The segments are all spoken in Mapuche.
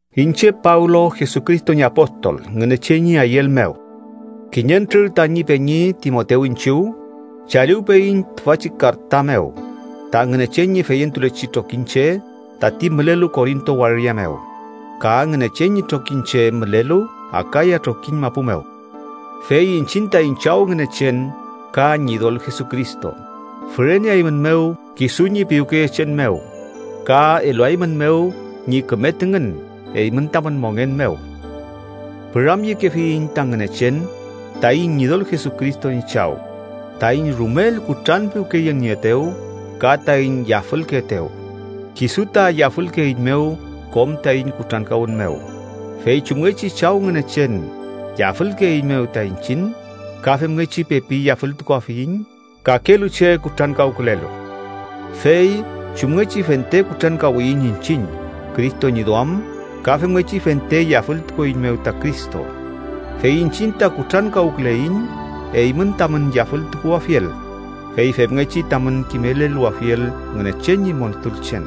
Iñche Pablo, Jesucristo ñi apostol Ngünechen ñi ayüel mew, kiñentrür tañi peñi Timotew iñchiw chaliwpeyiñ tüfachi karta mew ta Ngünechen ñi feyentulechi trokiñche tati mülelu Korinto waria mew ka Ngünechen ñi trokiñche mülelu Akaya trokiñ mapu mew. Fey iñchiñ taiñ Chaw Ngünechen ka Ñidol Jesucristo füreneaeymünmew kisu ñi piwkeyechen mew ka eluaeymünmew ñi küme tüngün eymün tamün mongen mew. Püramyekefiyiñ ta Ngünechen taiñ Ñidol Jesucristo ñi Chaw, taiñ rumel kutranpiwkeyenieetew ka taiñ yafülkeetew. Kisu ta yafülkeeiñmew kom taiñ kutrankawün mew, fey chumngechi Chaw Ngünechen yafülkeeiñmew ta iñchiñ, ka femngechi pepi yafültukuafiyiñ kakelu che kutrankawkülelu. Fey chumngechi fente kutrankawiyiñ iñchiñ Cristo ñi duam, ka femngechi fente yafültukueiñmew ta Cristo. Fey iñchiñ ta kutrankawküleiñ eymün tamün yafültukuwafiel fey femngechi tamün kimeleluwafiel Ngünechen ñi montulchen.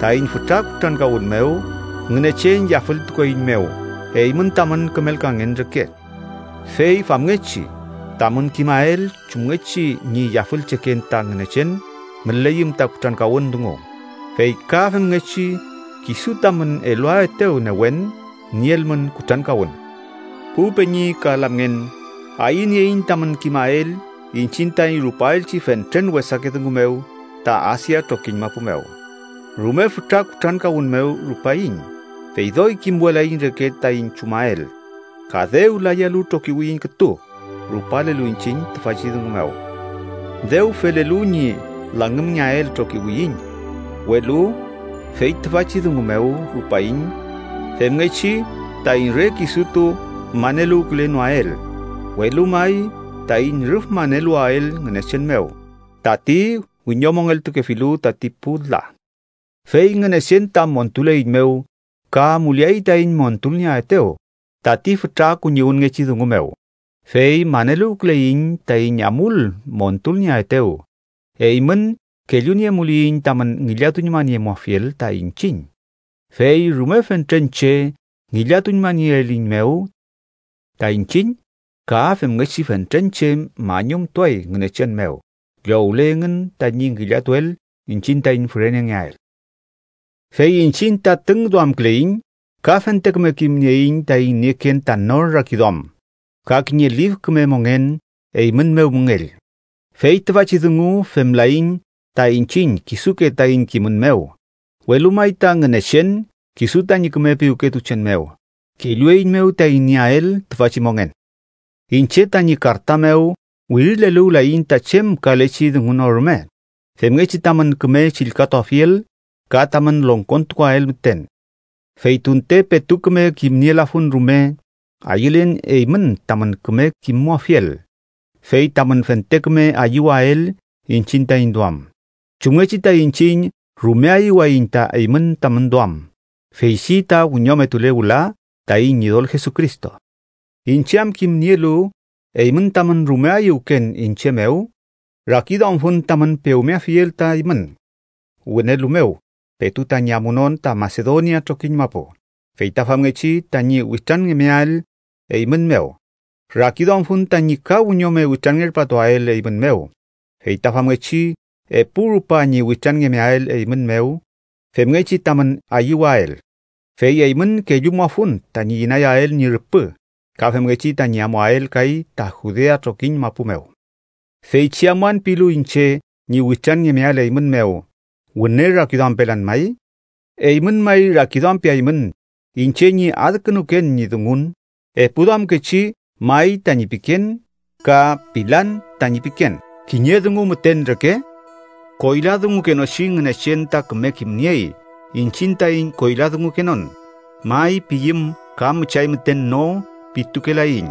Taiñ fütra kutrankawün mew Ngünechen yafültukueiñmew eymün tamün kümelkangen reke. Fey famngechi tamün kimael chumngechi ñi yafülcheken ta Ngünechen müleyüm ta kutrankawün dungu, fey ka femngechi kisu tamün eluaetew newen, nielmün kutrankawün. Pu peñi ka lamngen, ayünieiñ tamün kimael iñchiñ taiñ rupaelchi fentren wesake dungu mew ta Asia trokiñ mapu mew. Rume fütra kutrankawün mew rupaiñ, fey doy kimwelaiñ reke taiñ chumael, ka dew layalu trokiwiyiñ kütu rupalelu iñchiñ tüfachi dungu mew. Dew felelu ñi langümngeael trokiwiyiñ, welu fey tüfachi dungu mew rupaiñ femngechi taiñ re kisutu maneluwkülenoael, welu may taiñ rüf maneluwael Ngünechen mew, tati wiñomongeltukefilu tati pu la. Fey Ngünechen ta montuleiñmew ka amuleay taiñ montulnieaetew tati fütra kuñiwünngechi dungu mew. Fey maneluwküleiñ taiñ amul montulnieaetew eymün kelluniemuliyiñ tamün ngillatuñmaniemuafiel ta iñchiñ. Fey rume fentren che ngillatuñmanieeliyiñmew ta iñchiñ, ka femngechi fentren che mañumtuay Ngünechen mew llowle engün tañi ngillatuel iñchiñ taiñ fürenengeael. Fey iñchiñ ta tüngduamküleiñ ka fente küme kimnieiñ taiñ nieken ta nor rakiduam ka kiñe lif küme mongen eymün mew müngell. Fey tüfachi dungu femlaiñ ta iñchiñ kisuke taiñ kimün mew, welu may ta Ngünechen, kisu tañi küme piwketuchen mew, kellueiñmew taiñ nieael tüfachi mongen. Iñche tañi karta mew wirileluwlayiñ ta chem kalechi dungu no rume, femngechi tamün küme chillkatuafiel ka tamün longkontukuael müten. Fey tunte petu küme kimniemulafun rume, ayülen eymün tamün küme kimmuafiel. Fey tamün fente küme ayüwael iñchiñ taiñ duam, chumngechi ta iñchiñ rume ayüwayiñ ta eymün tamün duam, feychi ta wiñometule wüla taiñ Ñidol Jesucristo. Iñche am kimnielu eymün tamün rume ayüwken iñche mew, rakiduamfun tamün pewmeafiel ta eymün wünelu mew petu tañi amunon ta Masedonia trokiñ mapu, fey ta famngechi tañi witranngemeael eymün mew. Rakiduamfun tañi ka wiñome witranngerpatuael eymün mew, fey ta famngechi epu rupa ñi witranngemeael eymün mew femngechi tamün ayüwael. Fey eymün kellumuafun tañi inayael ñi rüpü ka femngechi tañi amuael kay ta Judea trokiñ mapu mew. Feychi amuan pilu iñche ñi witranngemeael eymün mew, ¿wüne rakiduampelan may? ¿Eymün may rakiduampeaymün iñche ñi adkünuken ñi dungun epuduamkechi “may” tañi piken, ka “pilan” tañi piken kiñe dungu müten reke? Koyladungukenochi Ngünechen ta küme kimniey iñchiñ taiñ koyladungukenon, “may” piyüm ka müchay müten “no” pitukelaiñ.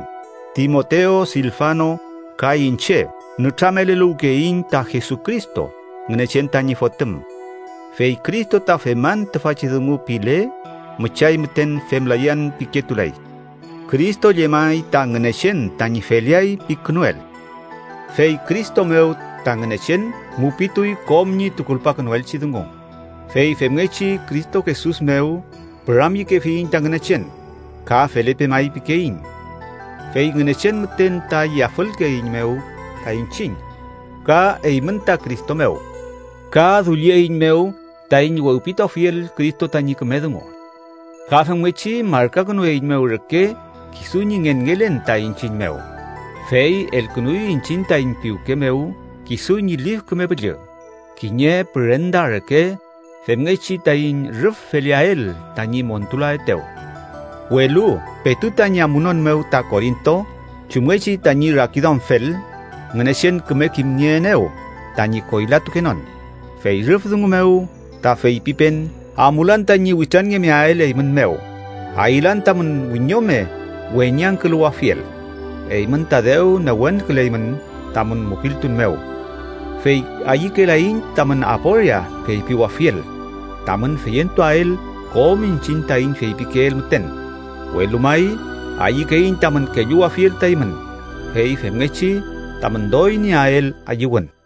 Timotew, Silfano ka iñche nütrameleluwkeyiñ ta Jesucristo, Ngünechen tañi Fotüm, fey Cristo ta “feman tüfachi dungu” pile, müchay müten “femlayan” piketulay. Cristo llemay ta Ngünechen tañi “feleay” pikünuel. Fey Cristo mew ta Ngünechen mupituy kom ñi tukulpakünuelchi dungu. Fey femngechi Cristo Jesus mew püramyekefiyiñ ta Ngünechen ka “felepe may” pikeiñ. Fey Ngünechen müten ta yafülkeeiñmew ta iñchiñ ka eymün ta Cristo mew, ka dullieiñmew taiñ wewpituafiel Cristo tañi küme dungu. Ka femngechi markakünueiñmew reke kisu ñi ngenngelen ta iñchiñ mew, fey elkünuy iñchiñ taiñ piwke mew kisu ñi Lif Küme Püllü kiñe pürenda reke femngechi taiñ rüf feleael tañi montulaetew. Welu petu tañi amunon mew ta Korinto, chumngechi tañi rakiduamfel, Ngünechen küme kimnieenew tañi koylatukenon. Fey rüf dungu mew ta feypipen amulan tañi witranngemeael eymün mew. Ayülan tamün wiñome weñangküluwafiel. Eymün ta dew newenküleymün tamün mupiltun mew, fey ayükelaiñ tamün aporia feypiwafiel tamün feyentuael kom iñchiñ taiñ feypikeel müten, welu may ayükeiñ tamün kelluwafiel ta eymün, fey femngechi tamün doy nieael ayüwün.